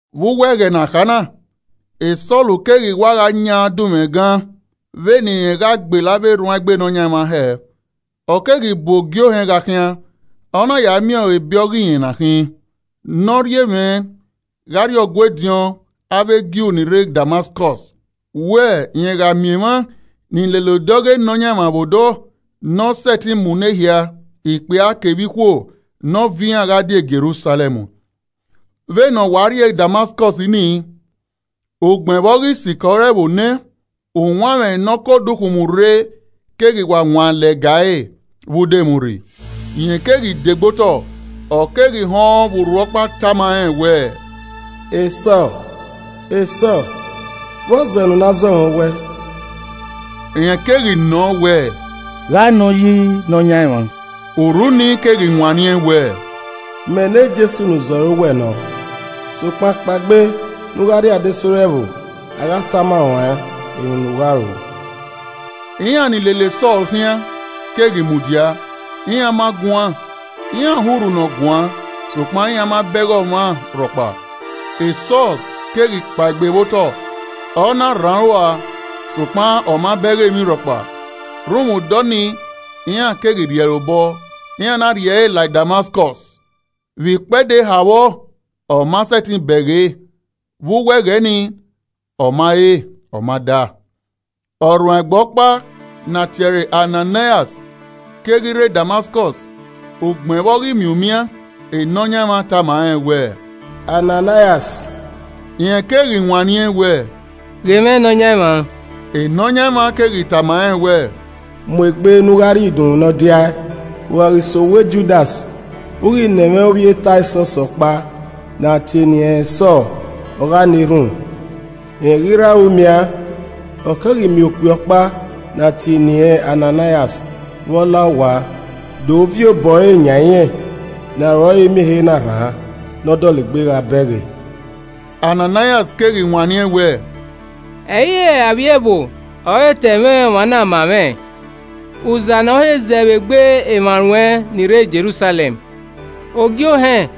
Vbe uwu ẹghẹ ne a kha na, e Sọl keghi wa gha yan dunmwu ẹgun vbe ne irẹn gha gbele avbe erhuanegbe Nọyaẹnmwa hẹ. Ọ keghi bu Ogie Ohẹn gha khian. Ọ na ya miẹn ẹre ebe ọghe rẹn ọna khin, ne ọ rhie mwẹ gha rrie Ọgua ediọn avbe Ju ni rre Damaskọs wẹ, rẹn gha miẹn emwa ni lele odẹ ọghe Nọyaẹnmwa vbe odọ, ne ọ sẹtin munọ ehia, ikpia kevbe ikhuo nọ viọ iran gha di e Jerusalẹm. Vbene ọ wa rrie Damaskọs nii, ugbẹn vbe ọ ghi sikẹ ore ẹvbo nẹ, uwanmwẹ ne ọ ke odukhunmwu re keghi wa wan lẹga ẹre vbe udomwurri. Rẹn keghi de gbe otọ, ọ keghi họn vbe urhu ọkpa tama rẹn wẹẹ, “Sọl, Sọl, vbọzẹ ne u na zọ mwẹ owẹ?” Rẹn keghi nọọn wẹ, “Gha nọ yi Nọyaẹnmwa?” Urhu nii keghi wanniẹn wẹẹ, “Mẹ ne Jesu ne u zọ ẹre owẹ nọ. Sokpan kpaegbe ne u gha rrie adesẹ ore ẹvbo, a gha tama ruẹn emwi ne u gha ru.” Iran ni lele Sọl khian keghi mudia, iran ma guan, iran họn Urhu ne ọ guan sokpan iran ma bẹghe ọmwa rhọkpa. Sọl keghi kpaegbe vbe otọ, ọ na rhan aro a, sokpan ọ ma bẹghe emwi rhọkpa. Rhunmwuda ọnii, iran keghi rhie ẹre obọ, iran na rhie ẹre la Damaskọs. Vbe ikpedẹ eha vbọ ọ ma sẹtin bẹghe, vbe uwu ẹghẹ nii, ọ ma re ọ ma da. Ọrhuanegbe ọkpa ne a tie ẹre Ananaias keghi re Damaskọs ugbẹn vbe ọ ghi miẹn umian, Nọyaẹnmwa tama rẹ wẹẹ, “Ananaias!” Rẹn keghi wanniẹn wẹẹ, “Ghe mwẹ Nọyaẹnmwa.” Nọyaẹnmwa keghi tama rẹn wẹẹ, “Mu egbe ne u gha rrie Idunmwu Nọdiae, u gha ghi sẹ owa Judas, u ghi nọ ẹmwẹ ovbi e Tasọs ọkpa ne a tie eni ẹnrẹn Sọl ọ gha na erhunmwu. Rẹn ghi rre aro umian, ọ keghi miẹn okpia ọkpa ne a tie eni ẹnrẹn Ananaias vbe ọ la owa do viọ obọ ẹre yan irẹn ne aro ẹre miẹn ehe na rhan, ne ọ dọlegbe gha bẹghe.” Ananaias keghi wanniẹn wẹẹ, “Ẹ i re avbiẹ ẹvbo ọ he ta ẹmwẹ ọmwa na ma mwẹ, uza ne ọ he zẹ vbe egbe emwa ruẹn ni rre Jerusalẹm. Ogie Ohẹn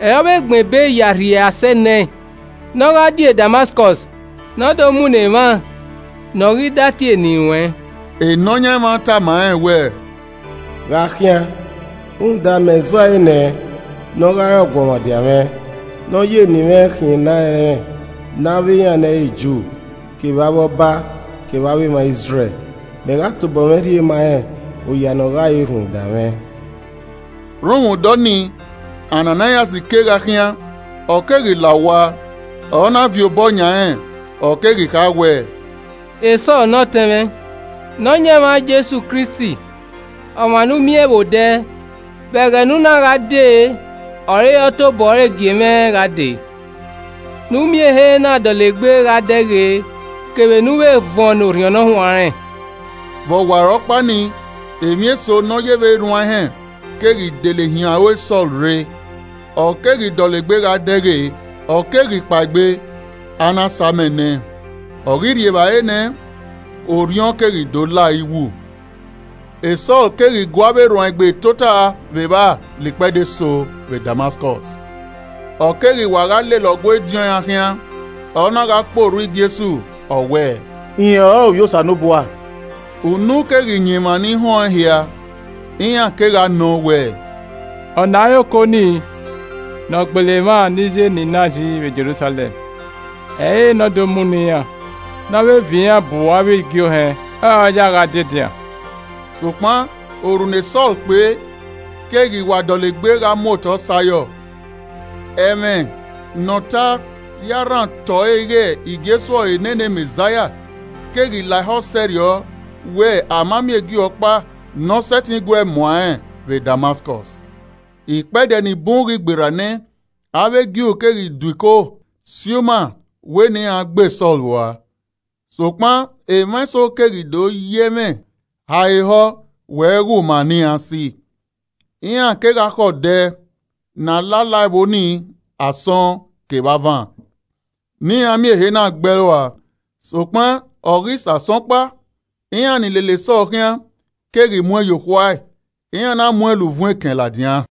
ọre ọ vbe gbẹn ebe ya rhie asẹ nẹẹn ne ọ gha die Damaskọs ne ọ do munọ emwa ne ọ ghi da tie eni ruẹn.” Nọyaẹnmwa tama rẹn wẹẹ, “Gha khian rhunmwuda mẹ zẹ ọe nẹ ne ọ gha re ọguọmwadia mwẹ, ne ọ ya eni mwẹ khian ne a rẹnrẹn ne avbe iran ne ẹ i re Ju kevbe avbe ọba kevbe emwa Izrẹl. Mẹ gha tobọ mwẹ rhie ma rẹn oya ne ọ gha re rhunmwuda mwẹ.” Rhunmwuda ọnii Ananaias kegha khian, ọ keghi la owa, ọ na viọ obọ yan rẹn, ọ keghi kha wẹẹ, “Sọl ne ọtẹn mwẹ, Nọyaẹnmwa Jesu Kristi ọmwa ne u miẹn vbe odẹ vbe ẹghẹ ne u na gha dee ọre ọ tobọ ẹre gie mwẹ gha dee, ne u miẹn ehe na dọlegbe gha dẹghe, kevbe ne u vbe vuọn ne Orhiọn Ne Ọ Huanrẹn.” Vbe ọwarọkpa nii, emwi eso ne Ọ yevbe erhuan ehẹn keghi dele hiẹn aro e Sọl rre, ọ keghi dọlegbe gha dẹghe. Ọ keghi kpaegbe, a na sa amẹ nẹẹn. Ọ ghi rri evbare nẹ, orhiọn keghi do la ẹre iwu. Sọl Kpe Orhu Vbe Damaskọs Sọl keghi gu avbe erhuanegbe tota vbe evba la ikpẹdẹ eso vbe Damaskọs. Ọ keghi wa gha lele Ọgua ediọn iran khian, ọ na gha kpe orhu Jesu, ọ wẹẹ, “Rẹn ọrọre Ovbi Osanobua.” Unu keghi yan emwa ni họn ẹn hia, iran kegha nọ wẹẹ, “Ọ na i re oko nii ne ọ gbele emwa ni ya eni na yi vbe Jerusalẹm? Ẹ i re ne ọ do munọ iran, ne ọ vbe viọ iran bu avbe igie ohẹn ọre ọ yae gha die edinran?” Sokpan orhu ne Sọl kpe keghi wa dọlegbe gha mu otọ sẹ ayọ. Ẹmwẹ ne ọ ta ya rhan otọ ẹre ighẹ Jesu ọrọre nene Mẹzaia keghi la ehọ sẹrriọ wẹẹ a ma miẹn Ju ọkpa ne ọ sẹtin guee muan ẹnrẹn vbe Damaskọs. Ikpẹdẹ ni bun ghi gberra nẹ, avbe Ju keghi do iko si uma wẹ ne iran gbe Sọl rua. Sokpan emwa eso keghi do ya ẹmwẹ ha ẹre ehọ we ghe uma ne iran si. Iran kegha khẹ odẹ ne a la la ẹvbo ni asọn kevbe avan ne iran miẹn ehe na gbe ẹe rua. Sokpan ọ ghi sẹ asọn ọkpa, iran ni lele Sọl khian keghi muẹn ye okhuae, iran na muẹn la uvun ekẹn ladian.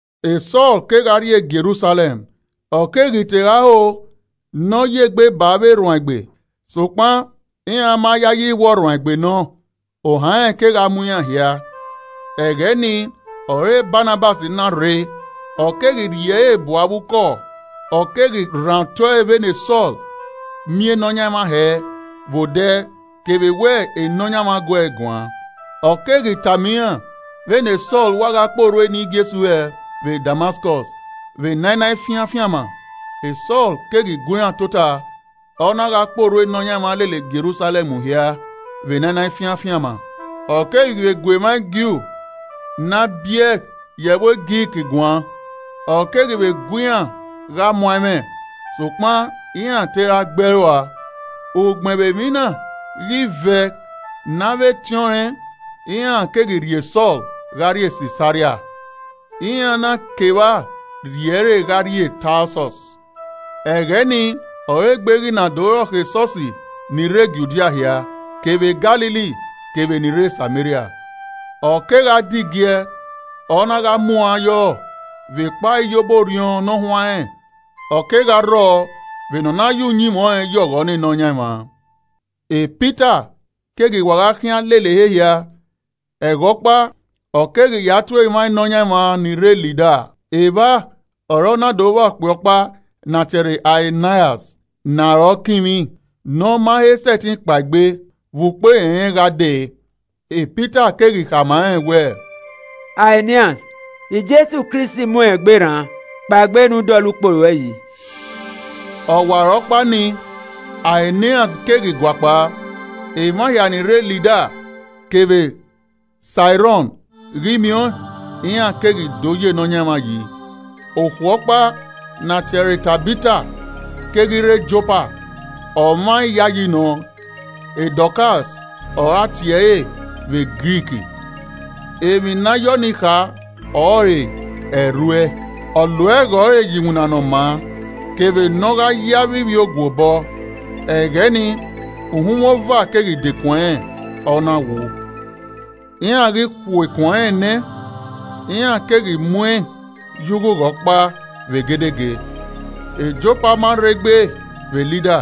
Sọl kegha rrie Jerusalẹm, ọ keghi te gha ho ne ọ ya egbe ba avbe erhuanegbe. Sokpan iran ma yayi wẹ ọrhuanegbe nọ, ohan rẹn kegha mu iran hia. Ẹghẹ nii ọre Banabas na rre ọ keghi rhie ẹre bu avbe ukọ ọ keghi rhan otọ vbene Sọl miẹn Nọyaẹnmwa hẹ vbe odẹ kevbe wẹ Nọyaẹnmwa gu ẹe guan. Ọ keghi vbe tama iran vbe ne Sọl wa gha kpe orhu eni Jesu hẹ vbe Damaskọs vbe ne a i na fian afianma. Sọl keghi gu iran tota, ọ na gha kpe orhu Nọyaẹnmwa lele Jerusalẹm hia vbe ne a i na fian afianma. Ọ keghi vbe gu emwa Ju ne a biẹ ye ẹvbo Grik guan, ọ keghi vbe gu iran gha muan ẹmwẹ, sokpan iran te ra gbe ẹe rua. Ugbẹn vbe emwi na ghi vẹ ne avbe etẹn rẹn, iran keghi rhie Sọl gha rrie Sisaria, iran na ke evba rhie ẹre gha rrie Tasọs. Ẹghẹ nii ọre egbe ghi na do rọkhọ esọsi ni rre Judia hia, kevbe Galili kevbe ni rre Sameria. Ọ kegha de igiẹ, ọ na gha muan yọ vbe ekpa iyobọ Orhiọn Ne Ọ Huanrẹn, ọ kegha rrọọ vbene ọ na ye uyinmwẹ ọnrẹn ya ọghọ ne Nọyaẹnmwa. Pita keghi wa gha khian lele ehe hia, ẹghẹ ọkpa, ọ keghi ya tuẹ emwa Nọyaẹnmwa ni rre Lida. Evba ọre ọ na do vba okpia ọkpa ne a tie ẹre Aeneas ne arọ kinmwi, ne ọ ma he sẹtin kpaegbe vbe ukpo erẹnrẹn gha dee. Pita keghi khama rẹn wẹẹ, “Aeneas, Jesu Kristi muẹn egbe rran. Kpaegbe ne u dọlọ ukpo ruẹ yi.” Ọwarọkpa nii, Aeneas keghi guakpao. Emwa hia ni rre Lida kevbe Siarọn ghi miẹn ọẹn, iran keghi do ya Nọyaẹnmwa yi. Okhuo ọkpa ne a tie ẹre Tabita keghi rre Jopa, ọmwa iyayi nọ. (Dọkas ọre a tie ẹre vbe Grik, emwi ne a ya ọnii kha ọrọre ẹrhuẹ.) Ọ lo ẹghẹ ẹre ye iwinna ne ọ maa kevbe ne ọ gha ye avbe ivbiogue obọ. Ẹghẹ nii, uhunmwu ova keghi dekun ẹnrẹn, ọ na wu. Iran ghi khuẹ ikun ẹnrẹn nẹ, iran keghi muẹn ye ughugha ọkpa vbe egedege. Jopa ma rrei gbe vbe Lida.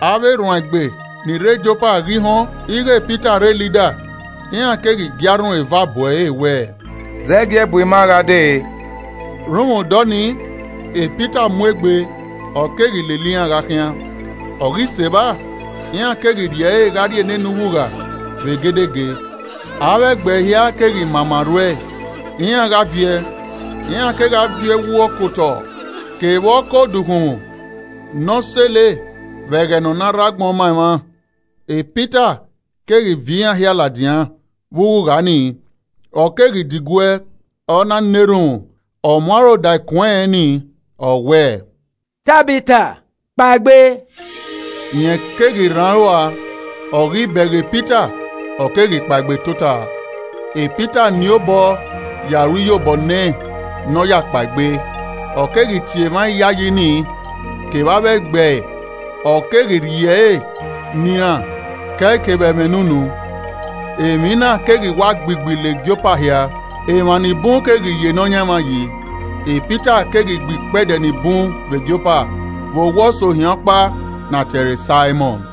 Avbe erhuanegbe ni rre Jopa ghi họn ighẹ Pita rre Lida, iran keghi gie arhunmwu eva bu ẹre wẹẹ, “Zẹgiẹ bu ima gha dee.” Rhunmwuda ọnii, Pita mu egbe ọ keghi lele iran gha khian. Ọ ghi sẹ evba, iran keghi rhie ẹre gha rrie nene ughugha vbe egedege. Avbe ẹgbẹe hia keghi mama rhuẹe, iran gha viẹ, iran kegha viọ ẹwu ọkotọ kevbe ọkodukhunmwu ne a sele vbe ẹghẹ ne ọ na rre agbọn ma emwa. Pita keghi viọ iran hia ladian vbe ughugha nii, ọ keghi diguẹ, ọ na na erhunmwu, ọ mu aro da ikun ẹnrẹn nii, ọ wẹẹ, “Tabita, kpaegbe!” Rẹn keghi rhan aro ua, ọ ghi bẹghe Pita, ọ keghi kpaegbe tota. Pita keghi nien obọ ya ru iyobọ nẹ ne ọ kpaegbe, ọ keghi tie emwa iyayi nii, kevbe avbe ẹgbẹe, ọ keghi rhie ẹre ne iran ke ẹe kevbe ẹmwẹ ne unu. Emwi na keghi wa gbigbi la Jopa hia, emwa ni bun keghi ya Nọyaẹnmwa yi. Pita keghi gbe ikpẹdẹ ni bun vbe Jopa vbe owa ọsohian ọkpa ne a tie ẹre Saimọn.